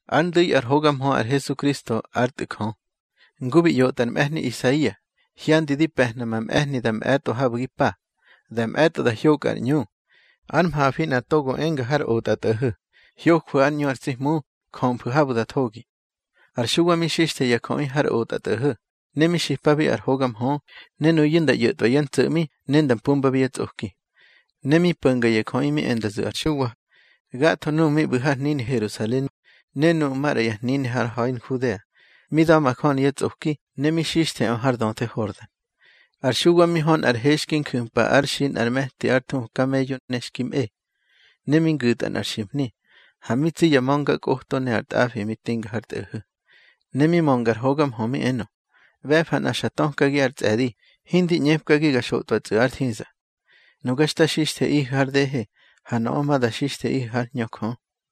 Ár ndu̱i ár hoga mhö ar Hesukristo ár Tꞌu̱ Jö. Ngu bi ꞌyotꞌa ar mꞌe̱hni Isaia: Hyandi di pe̱hna ma mꞌe̱hni da mꞌe̱tꞌo habu̱ gi pa, da mꞌe̱tꞌo da hyokꞌa ar ꞌñu. Ár mhafi nꞌa togo enga har otꞌatꞌo̱ho̱: Hyojwu̱ ár ꞌñu ar tsi Hmu; jömfu̱ habu̱ da thogi. Ar Xuwa mi xixthe ya jöꞌi har otꞌatꞌo̱ho̱, ne mi xipabi ar hoga mhö, ne nuyu̱ nda ꞌyo̱tꞌwa yá ntso̱ꞌmi ne nda mpumbabi yá tsꞌoki. Ne mi po̱nga ya jöꞌi mi e nda zu̱ ar Xuwa, gatho nuꞌu̱ mi ꞌbu̱ har hnini Herusalen ne nuꞌu̱ maꞌra ya hnini har ha̱i Nhudea, mi da̱majöni yá tsꞌoki, ne mi xixtheꞌö har döthe Hordan. Ar Xuwa mi hö nꞌar he xki nju̱mpa ár xi nꞌar me̱ti ár thuhu kameyo ne xki mꞌe, ne mi ngu̱tꞌa nꞌar ximhni, ha mi tsi ya ma̱ngakꞌoto ne ar tꞌafi mi tꞌinga har tꞌo̱ho̱. Ne mi mönga ar hoga mhö mi enö: —ꞌBe̱fa nꞌa xa tökagi ár tsꞌe̱di, hindi ꞌñepkagi ga xotꞌwatsꞌu̱ ár thiza. Nuga xta xixtheꞌihu̱ har dehe, ha nöꞌö ma da xixtheꞌihu̱ hár Hñö Jö.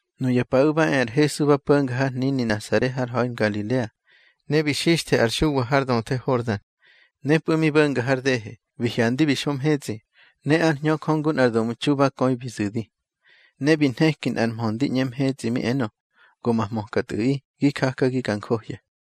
Nuya paꞌu̱ ba e ar Hesu ba po̱nga har hnini Nasare har ha̱i Ngalilea, ne bi xixthe ar Xuwa har döthe Hordan. Nepꞌu̱ mi bo̱nga har dehe, bi hyandi bi xo mhetsꞌi, ne ár Hñö Jö ngu nꞌar domtxu ba köi bi zu̱di. Ne bi nheki nꞌar mhö ndi ꞌñe mhetsꞌi mi enö: —Go ma hmöka Tꞌu̱ꞌi, gi jakagi ga njohya.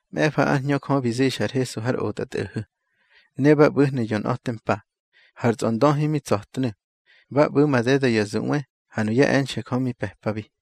Mꞌe̱fa ár Hñö Jö bi zixa ar Hesu har otꞌatꞌo̱ho̱. Ne ba ꞌbu̱hnu̱ yonꞌa̱te mpa, har tsꞌondöhi mi tsa̱tnu̱. Ba ꞌbu̱ madeda ya zuꞌwe, ha nuyá e̱nxe̱ Jö mi pe̱pabi.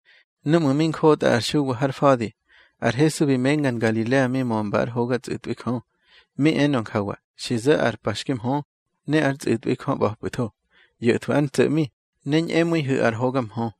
Núꞌmu̱ mi njotꞌa ar Xuwa har fa̱di, ar Hesu bi menga Ngalilea mi mömba ár hoga tsꞌu̱tꞌwi Jö. Mi enö njawa: —Xi zo̱ ar pa xki mhö, ne ár tsꞌu̱tꞌwi Jö ꞌba̱pꞌu̱tho. ꞌYo̱thwu̱ ár ntso̱ꞌmi, ne ñꞌemu̱ihu̱ ar hoga mhö.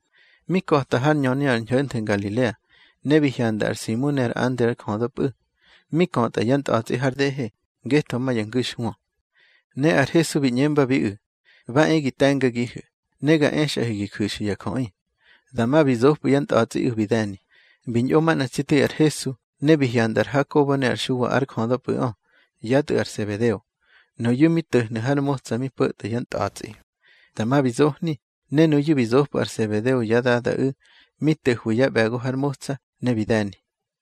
Mi ka̱ta hár ñöni ar ñho̱nthe Ngalilea, ne bi hyanda ar Simu ne ar Andre ár jödöpꞌu̱, mi kötꞌa yá ntꞌa̱tsꞌi har dehe, ngetho ma ya ngu̱xhwö. Ne ar Hesu bi ꞌñembabiꞌu̱: —Ba e gi te̱ngagihu̱, ne ga exꞌahu̱ gi ju̱xu̱ ya jöꞌi. Dama bi zopꞌu̱ yá ntꞌa̱tsꞌiꞌu̱ bi de̱ni. Bi ñꞌo manꞌa tsi tu̱i ar Hesu, ne bi hyanda ar Hakobo ne ar Xuwa ár jödöpꞌu̱ꞌö, yá tꞌu̱ ar Sebedeo. Nuyu̱ mi to̱hnu̱ har motsa mi po̱tꞌa yá ntꞌa̱tsꞌi. Dama bi zohni, ne nuyu̱ bi zopꞌu̱ ar Sebedeo yá dadaꞌu̱, mi to̱hwi yá ꞌbe̱go har motsa, ne bi de̱ni.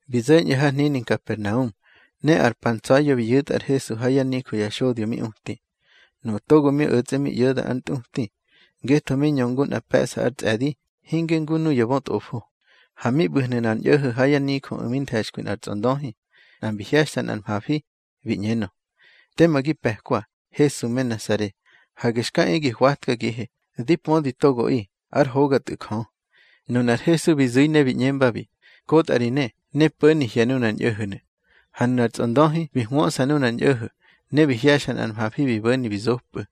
Bi zo̱ñꞌu̱ har hnini Nkapernaum, ne ar pa ntsa̱ya̱ bi yu̱tꞌa ar Hesu ha yá nijö ya xodyo mi uti. Nuꞌu̱ togo mi o̱tsꞌe mi ꞌyo̱da ár ntꞌuti, ngetho mi ñö ngu nꞌa pe̱ꞌsa ár tsꞌe̱di, hinge ngu nuya bötꞌofo. Ha mi ꞌbu̱hnu̱ nꞌar ñꞌo̱ho̱ ha yá nijöꞌu̱ mi nthe̱xkwi nꞌar tsꞌondöhi, nꞌa mbi hye̱xta nꞌar mhafi, bi ꞌñenö: —Tema gi pe̱kwa, Hesu me Nasare. Hage xka e gi hwatkagihe. Di pödi togoꞌi, ár hoga Tꞌu̱ Jö. Nunar Hesu bi zu̱i ne bi ꞌñembabi: —Kotꞌa ri ne, ne po̱ni hye̱ nunar ñꞌo̱ho̱nu̱. Ha nunar tsꞌondöhi bi hwöꞌsa nunar ñꞌo̱ho̱, ne bi hye̱xa nꞌar mhafi bi bo̱ni bi zopꞌu̱.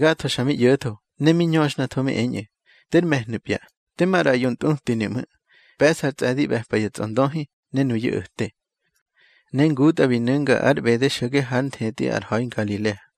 Gatho xa mi ꞌyo̱tho, ne mi ñöxhnatho mi eñꞌu̱: —Ter me̱hnu̱pya. Tema ꞌraꞌyo ntꞌutinu̱ ꞌmu̱. Pe̱ꞌsa ar tsꞌe̱di ꞌbe̱pa ya tsꞌondöhi, ne nuyu̱ o̱te. Ne ngutꞌa bi nu̱nga ár ꞌbede xo̱ge hár nthetꞌi ar ha̱i Ngalilea.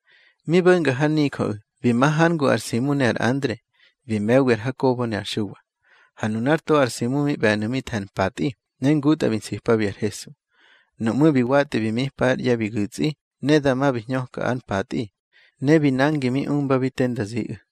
Mi bo̱nga hár nijöꞌu̱, bi ma hár ngu ar Simu ne ar Andre, bi me̱wi ar Hakobo ne ar Xuwa. Ha nunár to ar Simu mi ꞌbe̱nu̱ mi the̱ ar mpatꞌi, ne ngutꞌa bi nsipabi ar Hesu. Nuꞌmú̱ bi watꞌi bi mipa ár ꞌye̱ bi gu̱tsꞌi, ne dama bi hñöka ár mpatꞌi, ne bi nangi mi umbabi te nda ziꞌu̱.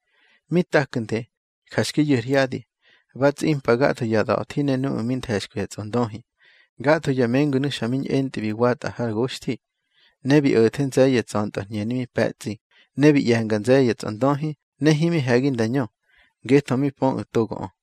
Mi taknde, ja xki yu̱ ar hyadi, ba tsꞌimpa gatho ya da̱thi ne nuꞌu̱ mi nthe̱xkwi ya tsꞌondöhi. Gatho ya mengunu̱ xa mi ñꞌentꞌi bi watꞌa har goxthi. Ne bi o̱the nze̱ye̱ tsa̱ntꞌö ar hñeni mi pe̱tsꞌi, ne bi ꞌye̱nga nze̱ye̱ ya tsꞌondöhi, ne himi he̱gi nda ñö, ngetho mi pöꞌu̱ togoꞌö.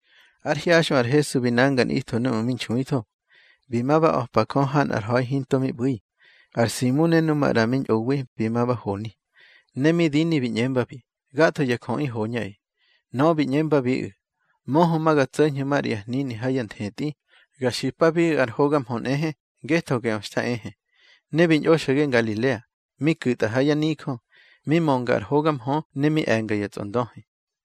Ár hyaxꞌö ar Hesu bi nanga nꞌitho núꞌmu̱ mi nxuitho, bi ma ba a̱pa Jö ha nꞌar ha̱i hinto mi ꞌbu̱i. Ar Simu ne nu maꞌra mi ñꞌowi, bi ma ba honi. Ne mi dini bi ꞌñembabi: —Gatho ya jöꞌi hoñꞌaꞌi. Nöꞌö bi ꞌñembabiꞌu̱: —Möhö ma ga tso̱ñhu̱ maꞌra ya hnini ha ya nthetꞌi, ga xipabiꞌu̱ ar hoga mhö nꞌehe, ngetho geꞌö xta ehe. Ne bi ñꞌo xo̱ge Ngalilea, mi ku̱tꞌa ha yá nijö, mi mönga ar hoga mhö ne mi e̱nga ya tsꞌondöhi.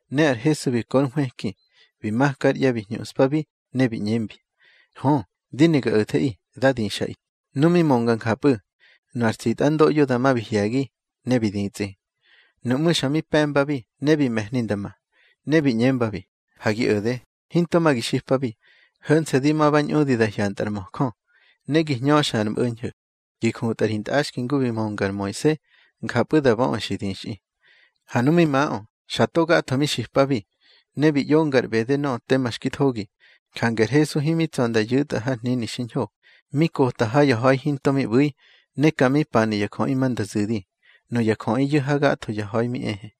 Ne ar Hesu bi ko ár nhwëki, bi maka ár ꞌye̱ bi hñuꞌspabi, ne bi ꞌñembi: —Hö, di ne ga o̱theꞌi. Dá dixꞌaꞌi. Nu mi mönga njapꞌu̱, nu ar tsitꞌandoꞌyo dama bi hye̱gi, ne bi ditsꞌi. Nuꞌmú̱ xa mi pe̱mbabi, ne bi me̱hni nda ma. Ne bi ꞌñembabi: —Ha gi o̱de, hinto ma gi xipabi. Ho̱nse̱ di ma ba ñꞌudi da hyantꞌa ar möjö. Ne gi hñöxa ar mꞌo̱ñho̱, gi jutꞌa ri ntꞌaxki ngu bi mönga ar Moise, njapꞌu̱ da böꞌu̱ xi dixꞌi. Ha nu mi maꞌö, xa to gatho mi xipabi, ne bi ꞌyonga ar ꞌbede nöꞌö tema xki thogi. Jange ar Hesu himi tsa̱ nda yu̱tꞌa har hnini xiñho. Mi kota ha ya ha̱i hinto mi ꞌbu̱i, ne ka mi panu̱ ya jöꞌi ma nda zu̱di. Nuya jöꞌiyu̱ hagatho ya ha̱i mi ehe.